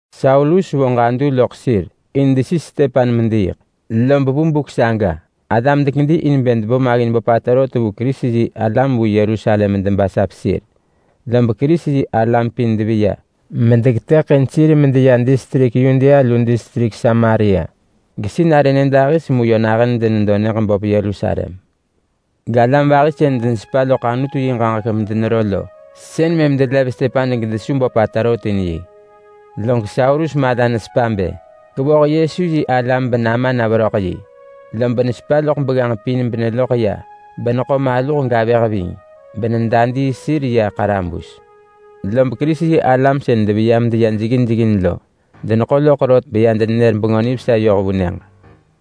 Saulus vo ġadu loḳ sir in desis Stepan mediiḳ. Lob vu buk saga alam dekedi in bë debo maggin böpata rot vu Kerisi-yi-alam vu Yerusalem medebasap sir. Lob Kerisi-yi-alam pin deveya medeketëḳin sir medeya distrik Yudea lu distrik Samaria gesinarë nyëdahis mu yö nahën denedo nyëġ böp Yerusalem. Galam vahi sën denesepa loḳ Anutu yi ġaġek medenero lo, sën mëm delev Stepan gedesu böpata rot in yi. Log Saulus mala nesepa bë kevoh Yesu yi alam benama na veröḳ yi, lob nesepa loḳ begganġ pin beneloḳ ya beneḳo maluh gavëh ving, benedadii sir ya ḳarabus. Lob Kerisi-yi-alam sën deveya medeya jeggin jeggin lo deneḳo loḳ rot beya denenër Bengö Nivesa yoh vu nyëġ.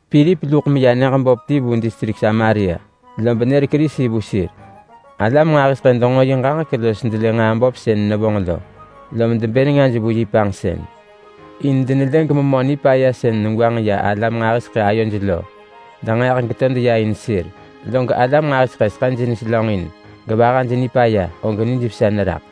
Pilip luḳ meya nyëġ böp ti vu distrik Samaria, lob nër Kerisi vu sir. Alam nġahiseḳë denġo yi ġaġek los delë nġaa böp sën nevonġ lo, lom debë nengaj vu yi panġsën. In denelë gememö nipaya sën negwanġ ya alam nġahiseḳë ayoj lo denġeeḳ geto deya in sir. Log alam nġahiseḳë seḳëj neselönġin, gevahaj nipaya, og nijvesa neraḳ.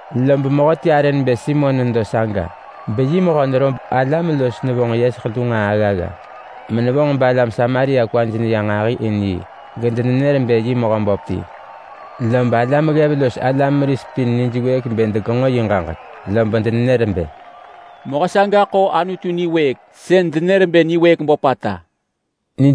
Lob mehöti arë nebë Simon nedo saga, beyi mehö nerob alam los nevonġ yeseḳ lu nġaa aggagga, menevonġ balam Samaria kwaj neya nġahi in yi gedenër bë yi mehö böp ti. Lob alam ggev los alam meris pin nijwëëk bë degenġo yi ġaġek, lob denenër bë, “Mehö saga ḳo Anutu niwëëk böpata yönon!”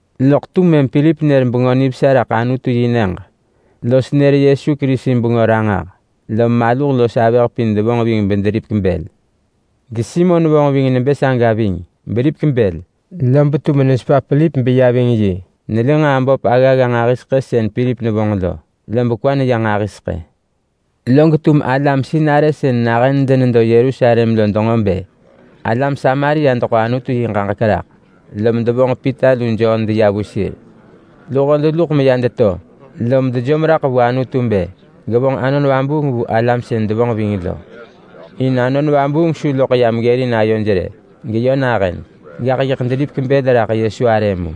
Loḳ tum mëm Pilip nër Bengö Nivesa raḳ Anutu-yi-nyëġ los nër Yesu Kerisi bengö ranġah, lom maluh los avëh pin devonġ ving bederipek bël. GeSimon vonġ ving nebë saga ving beripek bël, lob tum nesepa Pilip beya ving yi. Nelë nġaa böp aggagga nġahiseḳë sën Pilip nevonġ lo, lob kwa neya nġahiseḳë. Log tum alam sinarë sën nahën denedo Yerusalem lo denġo bë alam Samaria deḳo Anutu yi ġaġek raḳ, lom devonġ Pita lu Jon deya vu sir. Luho deluḳ meya deto, lom dejom raḳ vu Anutu in bë gevonġ Anon Vabuung vu alam sën denevonġ ving lo. In Anon Vabuung su loḳ yam ggërin ayoj rë, geyö nahën. Gaḳ yiḳ deripek bël raḳ Yesu arë mu.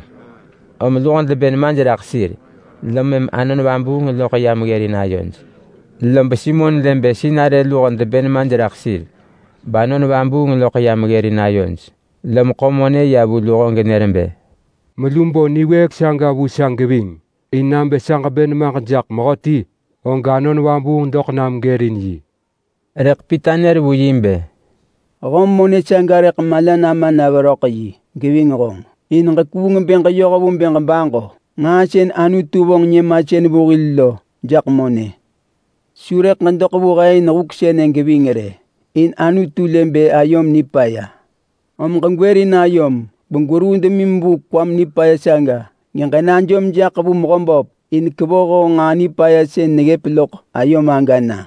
Om luho debë nemaj raḳ sir, lom mëm Anon Vabuung loḳ yam ggërin ayoj. Lob Simon lë bë sinarë luho debë nemaj raḳ sir bAnon Vabuung loḳ yam ggërin ayoj, lom ḳo monë ya vu luho genër bë, “Melu bo niwëëk saga vu sa geving, in nabë sa ġebë nemaġ jaḳ mehöti, og Anon Vabuung doḳ nam gërin yi.” Rëḳ Pita nër vu yi bë, “Höm monë mala nama na veröḳ yi, behonġ geving! In ġekuung bë ġeyoh vu bë ġebaġo Nġaa sën Anutu vonġ nyëmasën vu hil lo jaḳ monë! Su rëḳ ġedoḳ vu he in huk sënë geving rë, in Anutu lë bë ayom nipaya. Om ġegwërin ayom begweruu demim vu kwam nipaya saga, geġenajom jaḳ vu Mehöböp in kevoh honġ nġaa nipaya sën neggëp loḳ ayom aga na.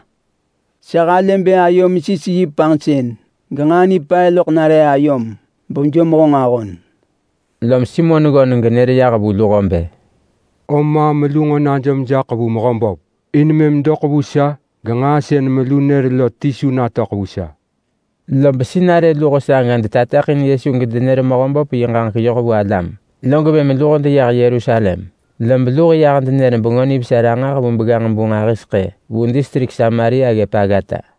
Sa halë bë ayom sis yi panġsën, genġaa nipaya loḳ nare ayom bejom honġ ahon.” Lom Simon neggöneng genër yah vu luho bë, “Om maam melu nġo najom jaḳ vu Mehöböp in mëm doḳ vu sa genġaa sën melu nër lo ti su natöḳ vu sa!” Lob sinarë luho saga denër Yesu ranġah bedevonġ Mehöböp yi ġaġek yoh vu alam, log mëm luho deyah Yerusalem. Lob luho yah denër Bengö Nivesa ranġah vu begganġ-bu nġahiseḳë vu distrik Samaria ggëp aggata.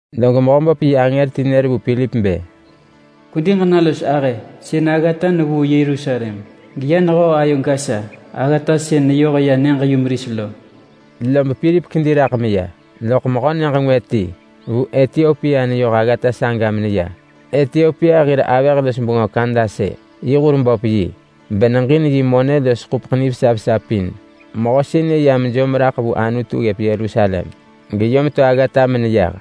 Log Mehöböp yi angër ti nër vu Pilip bë, “Kwedi ġena los ahë sën aggata nevuu Yerusalem geya nehöö ayo Gasa. Aggata sën neyoh ya nyëġ-yumeris lo.” Lob Pilip kedi raḳ meya. Loḳ mehö nyëġ ngwë ti vu Etiopia neyoh aggata saga meneya. Etiopia hir avëh-los-bengö Kandase yi hur böp yi, beneġin yi monë los yi ḳupeḳ nivesa vesa pin. Mehö sënë ya mejom raḳ vu Anutu ggëp Yerusalem geyom to aggata meneyah.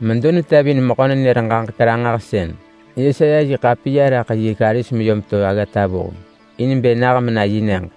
Medo netevin mehö-nenër-ġaġek-ranġahsën Yesaya yi ḳapiya raḳ yi karis meyom to aggata vuheng in bë nah mena yi nyëġ.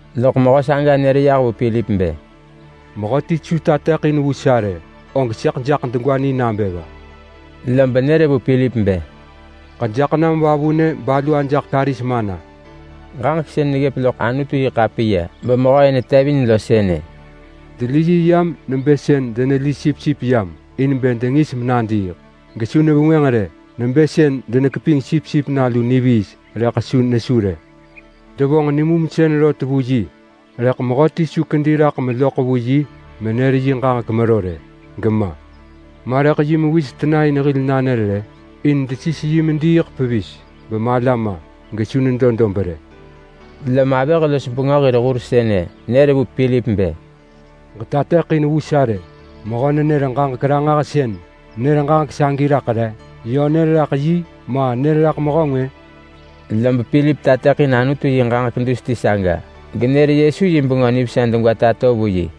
Loḳ mehö saga nër yah vu Pilip bë, “Bë mehöti su tateḳin vu sa rë, og sëḳ jaḳ degwa ni nabë va?” Lob nër vu Pilip bë, “Ġejaḳ nam vavunë balu ajaḳ karis mana!” Ġaġek sën neggëp loḳ Anutu-yi-ḳapiya bemehö-ë netevin lo sënë: “Deli yi yam nebë sën deneli sipsip yam in bë dengis menadiiḳ, gesu nevengwënġ rë. Nebë sën denekeping sipsip nalu niviis, rëḳ su nesu rë. Devonġ nimumsën rot vu yi, rëḳ mehöti su kedi raḳ meloḳ vu yi menër yi ġaġek mero rë gema. Ma rëḳ yi mewis tena in hil nanër rë? In desis yi mediiḳ pevis bemala ma gesu nedo dob rë.” Lom avëh-los-bengö yi hur sënë nër vu Pilip bë, “Ġetateḳin vu sa rë! Mehö-nenër-ġaġek-ranġahsën nër ġaġek sagi raḳ re? Yö nër raḳ yi, ma nër raḳ mehö ngwë?” Lob Pilip tateḳin Anutu yi ġaġek dus ti saga genër Yesu yi Bengö Nivesa degwa tato vu yi.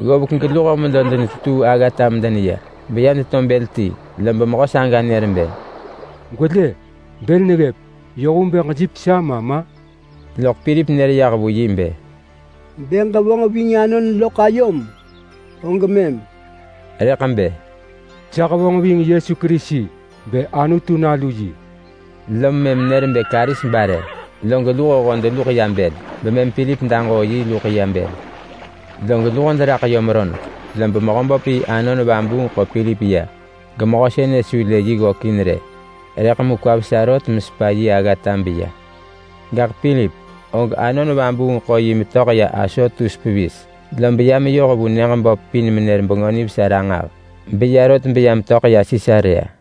Ggovek geluho medo denetetuu aggata medeneya beya deto bël ti, lob mehö saga nër bë, “Gwelë! Bël neggëp! Yoh vu bë ġejipek sa ma ma?” [Loḳ Pilip nër yah vu yi bë, “Bë ġevonġ ving anon loḳ ayom, og mëm!” Rëḳ bë, “Sa hevonġ ving Yesu Kerisi bë Anutu nalu yi!”] Lob mëm nër bë karis bare, log luhoho medeluḳ ya bël, bemëm Pilip daġoo yi luḳ ya bël. Log luho deraḳ yom roneḳ, lob Mehöböp yi Anon Vabuung ḳo Pilip ya, gemehö sënë su lë yi ggökin rë, rëḳ mu kwa vesa rot mesepa yi aggata beya. Gaḳ Pilip, og Anon Vabuung ḳo yi metöḳ ya Asotus pevis, lob ya meyoh vu nyëġ böp pin menër Bengö Nivesa ranġah. Beya rot beya metöḳ ya Sisarea.